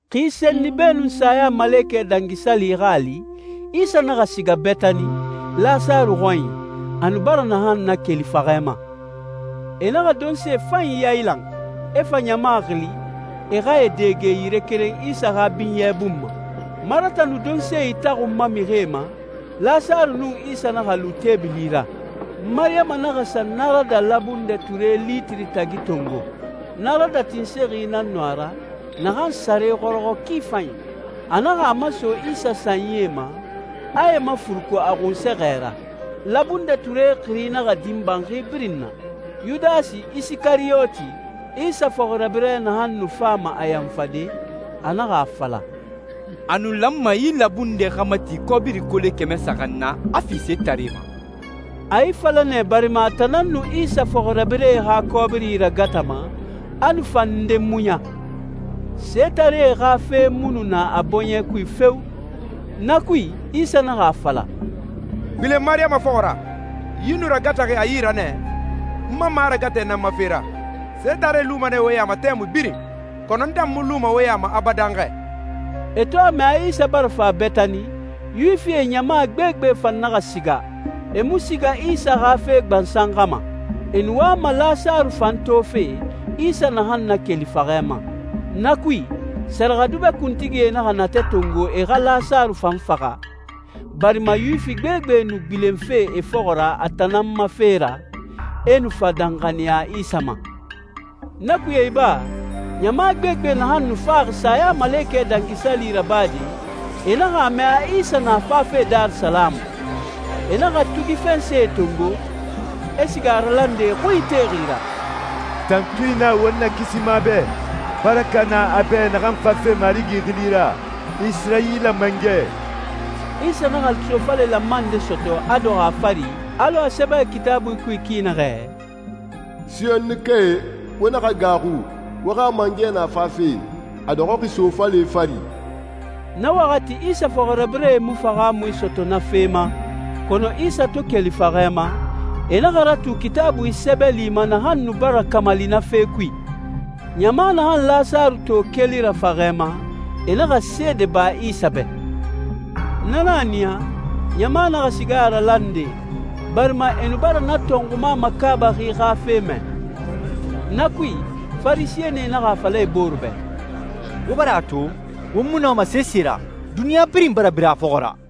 Xi senni beenun Sayamalekɛ Dangi Sali xa a li, Isa naxa siga Betani, Lasaru xɔnyi, a nu bara naxan nakeli faxɛ ma. E naxa donse fanyi yailan, e fa ɲama xili, e xa e dɛge yire keren Isa xa binyɛ bun ma. Marata nu donse itaxunma mixie ma, Lasaru nun Isa naxa lu teebili ra. Mariyama naxa sa narada labundɛ ture litiri tagi tongo. Narada tinsexi nan nu a ra, naxan sare xɔrɔxɔ ki fanyi. A naxa a maso Isa sanyie ma, a e mafuruku a xunsɛxɛ ra. Labundɛ ture xiri naxa din banxi birin na. Yudasi Isikariyoti, Isa fɔxirabirɛ naxan nu fama a yanfade, a naxa a fala, «A nu lanma yi labundɛ xa mati kɔbiri kole kɛmɛ saxan na, a fi setaree ma.» A yi fala nɛ barima a tan nan nu Isa fɔxirabirɛe xa kɔbiri ragatama, a nu fa nde muɲa. Setaree xa fe mu nu na a bɔɲɛ kui feo! Na kui, Isa naxa a fala, «Gbilen Mariyama fɔxɔ ra. Yi nu ragataxi a yi ra nɛ, n ma maragatɛ nan ma fe ra. Setaree luma nɛ wo ya ma tɛmui birin, kɔnɔ n tan mu luma wo ya ma abadan xɛ.» E to a mɛ a Isa bara fa Betani, Yuwifie ɲama gbegbe fan naxa siga. E mu siga Isa xa fe gbansan xa ma. E nu wama Lasaru fan tofe, Isa naxan nakeli faxɛ ma. Na kui, sɛrɛxɛdubɛ kuntigie naxa natɛ tongo e xa Lasaru fan faxa, barima Yuwifi gbegbe nu gbilenfe e fɔxɔ ra a tan nan ma fe ra, e nu fa danxaniya Isa ma. Na kuye iba, ɲama gbegbe naxan nu faxi Sayamalekɛ Dangi Sali rabade, e naxa a mɛ a Isa na fafe Darisalamu. E naxa tugi fɛnsɛe tongo, e siga a ralande e xui ite ra, «Tantui na won Nakisima bɛ! Baraka na a bɛ naxan fafe Marigi xili ra, Isirayila mangɛ!» Isa naxa sofale lanma nde sɔtɔ, a dɔxɔ a fari, alɔ a sɛbɛxi Kitaabui kui ki naxɛ, «Siyonikae, wo naxa gaaxu. Wo xa mangɛ na fafe, a dɔxɔxi sofale fari.» Na waxati Isa fɔxirabirɛe mu fahaamui sɔtɔ na fe ma, kɔnɔ Isa to keli faxɛ ma, e naxa ratu Kitaabui sɛbɛli ma naxan nu bara kamali na fe kui. Ɲama naxan Lasaru to keli ra faxɛ ma, e naxa seede ba Isa bɛ. Na nan a niya, ɲama naxa siga a ralande, barima e nu bara na tɔnxuma makaabaxi xa fe mɛ. Na kui, Farisɛnie naxa a fala e bore bɛ, «Wo bara a to, won mu nɔma sese ra. Duniɲa birin bara bira a fɔxɔ ra!»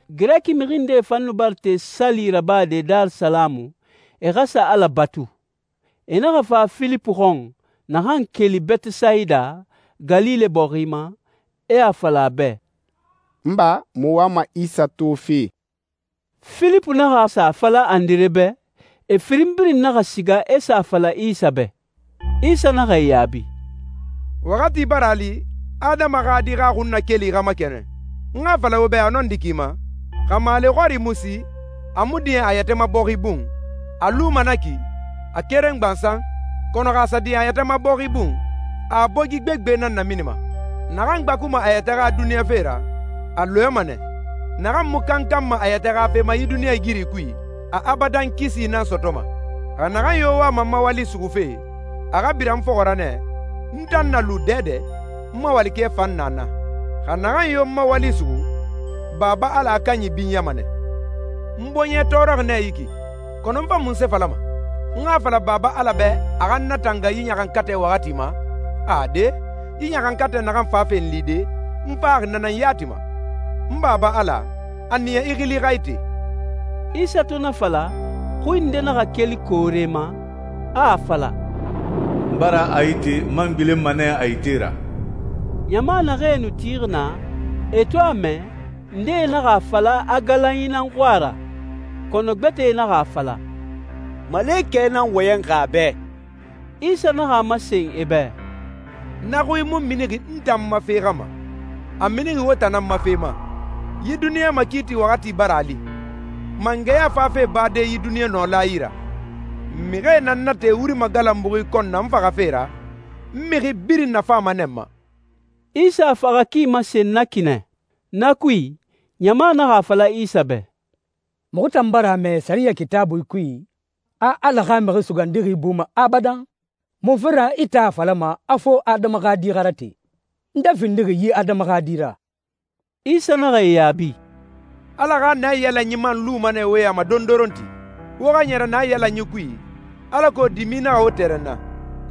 Girɛki mixi ndee fan nu bara te sali rabade Darisalamu, e xa sa Ala batu. E naxa fa Filipu xɔn, naxan keli Betesayida, Galile bɔxi ma, e a fala a bɛ, «N ba, muxu wama Isa tofe.» Filipu naxa sa a fala Andire bɛ, e firin birin naxa siga e sa a fala Isa bɛ. Isa naxa e yaabi, «Waxati bara a li Adama xa Di xa xunnakeli xa makɛnɛn. N xa a fala wo bɛ a nɔndi ki ma, xa maale xɔri mu si, a mu diɲɛ a yɛtɛ ma bɔxi bun, a luma na ki, a keren gbansan. Kɔnɔ xa a sa diɲɛ a yɛtɛ ma bɔxi bun, a a bogi gbegbe nan naminima. Naxan gbakuma a yɛtɛ xa duniɲa fe ra, a lɔɛma nɛ. Naxan mu kankanma a yɛtɛ xa fe ma yi duniɲɛigiri kui, a abadan kisi nan sɔtɔma. Xa naxan yo wama n ma wali suxufe, a xa bira n fɔxɔ ra nɛ, n tan na lu dɛdɛ, n ma walikɛ fan na naa. Xa naxan yo n ma wali suxu, Baba Ala a kanyi binyama nɛ.» «N bɔɲɛ tɔɔrɔxi nɛ yi ki, kɔnɔ n fa munse falama? N xa a fala Baba Ala bɛ a xa n natanga yi ɲaxankatɛ waxati ma? Ade, yi ɲaxankatɛ naxan fafe n lide, n faxi na nan yati ma. N Baba Ala, a niya i xili xa ite.» Isa to na fala, xui nde naxa keli koore ma, a a fala, «N bara a ite, n man gbilenma nɛ a ite ra.» Ɲama naxee nu tixi naa, e to a mɛ, ndee naxa a fala a galanyi nan xui a ra, kɔnɔ gbɛtɛ naxa a fala, «Malekɛ nan wɔyɛnxi a bɛ!» Isa naxa a masen e bɛ, «Na xui mu minixi n tan n ma fe xa ma, a minixi wo tan nan ma fe ma. Yi duniɲa makiiti waxati bara a li. Mangɛya fafe bade yi duniɲa nɔla yi ra. Mixie na n nate wuri magalanbuxi kɔn na n faxafe ra, n mixi birin nafama nɛ n ma.» Isa a faxa ki masen na ki nɛ. Na kui, ɲama naxa a fala Isa bɛ, «Muxu tan bara a mɛ sɛriyɛ Kitaabui kui, a Ala xa Mixi Sugandixi buma abadan. Munfe ra i tan a falama a fo Adama xa Di xa rate? Nde findixi yi Adama xa Di ra?» Isa naxa e yaabi, «Ala xa naiyalanyi man luma nɛ wo ya ma dondoronti. Wo xa ɲɛrɛ na naiyalanyi kui, alako dimi naxa wo tɛrɛnna.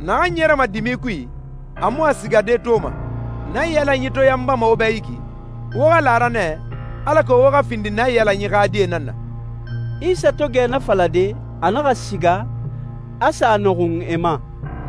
Naxan ɲɛrɛma dimi kui a mu a sigade toma. Naiyalanyi to yanbama wo bɛ yi ki, wo xa la a ra nɛ, alako wo xa findi naiyalanyi xa die nan na.» Isa to gɛ na falade, a naxa siga, a sa a nɔxun e ma.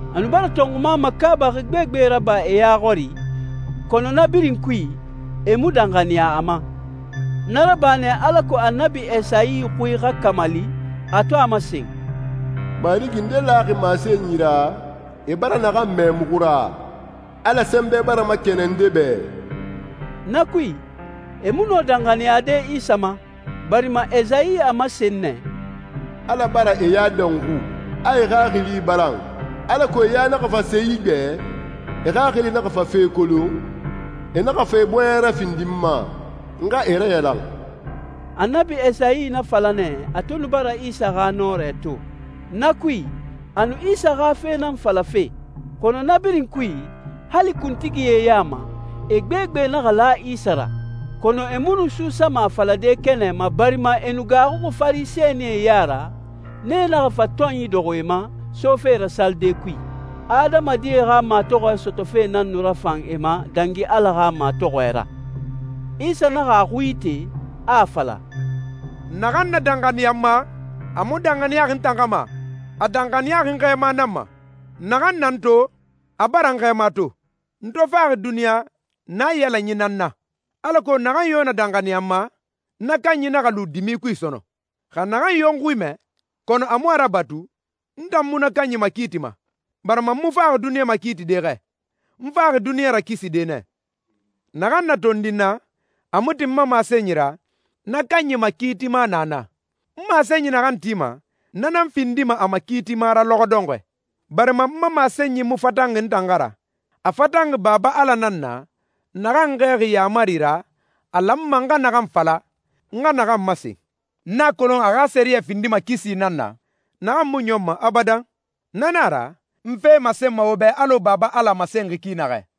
A nu bara tɔnxuma makaabaxi gbegbe raba e ya xɔri, kɔnɔ na birin kui, e mu danxaniya a ma. Na raba nɛ alako Annabi Esayi xui xa kamali, a to a masen, «Marigi, nde laxi masenyi ra, e bara naxan mɛ muxu ra? Ala sɛnbɛ bara makɛnɛn nde bɛ?» Na kui, e mu nɔ danxaniyade Isa ma, barima Esayi a masen nɛ, «Ala bara e ya dɔnxu, a e xaxili balan, alako e ya naxa fa se igbɛ, e xaxili naxa fa fe kolon, e naxa fa e bɔɲɛ rafindi n ma, n xa e rayalan.» Annabi Esayi na fala nɛ a to nu bara Isa xa nɔrɛ to. Na kui, a nu Isa xa fe nan falafe. Kɔnɔ na birin kui, hali kuntigie ya ma, e gbegbe naxa la Isa ra. Kɔnɔ e mu nu suusama a falade kɛnɛ ma barima e nu gaaxuxi Farisɛnie ya ra, nee naxa fa tɔnyi dɔxɔ e ma, sofe ra salide kui. Adamadie xa matɔxɔɛ sɔtɔfe nan nu rafan e ma dangi Ala xa matɔxɔɛ ra. Isa naxa a xui ite, a a fala, «Naxan na danxaniya n ma, a mu danxaniyaxi n tan xa ma, a danxaniyaxi n Xɛɛma nan ma. Naxan na n tan to, a bara n Xɛɛma to. N to faxi duniɲa, naiyalanyi nan n na, alako naxan yo na danxaniya n ma, na kanyi naxa lu dimi kui sɔnɔn. Xa naxan yo n xui mɛ, kɔnɔ a mu a rabatu, n tan mu na kanyi makiitima, barima n mu faxi duniɲa makiitide xɛ. N faxi duniɲa rakiside nɛ. Naxan na tondi n na, a mu tin n ma masenyi ra, na kanyi makiitima na na. N masenyi naxan tima, na nan findima a makiitima ra lɔxɔ dɔnxɔɛ. Barima n ma masenyi mu fatanxi n tan xa ra. A fatanxi Baba Ala nan na, naxan n xɛɛxi yaamari ra, a lanma n xa naxan fala, n xa naxan masen. N a kolon a xa sɛriyɛ findima kisi nan na, naxan mu ɲɔnma abadan. Na nan a ra, n fe masenma wo bɛ alɔ Baba Ala a masenxi ki naxɛ.»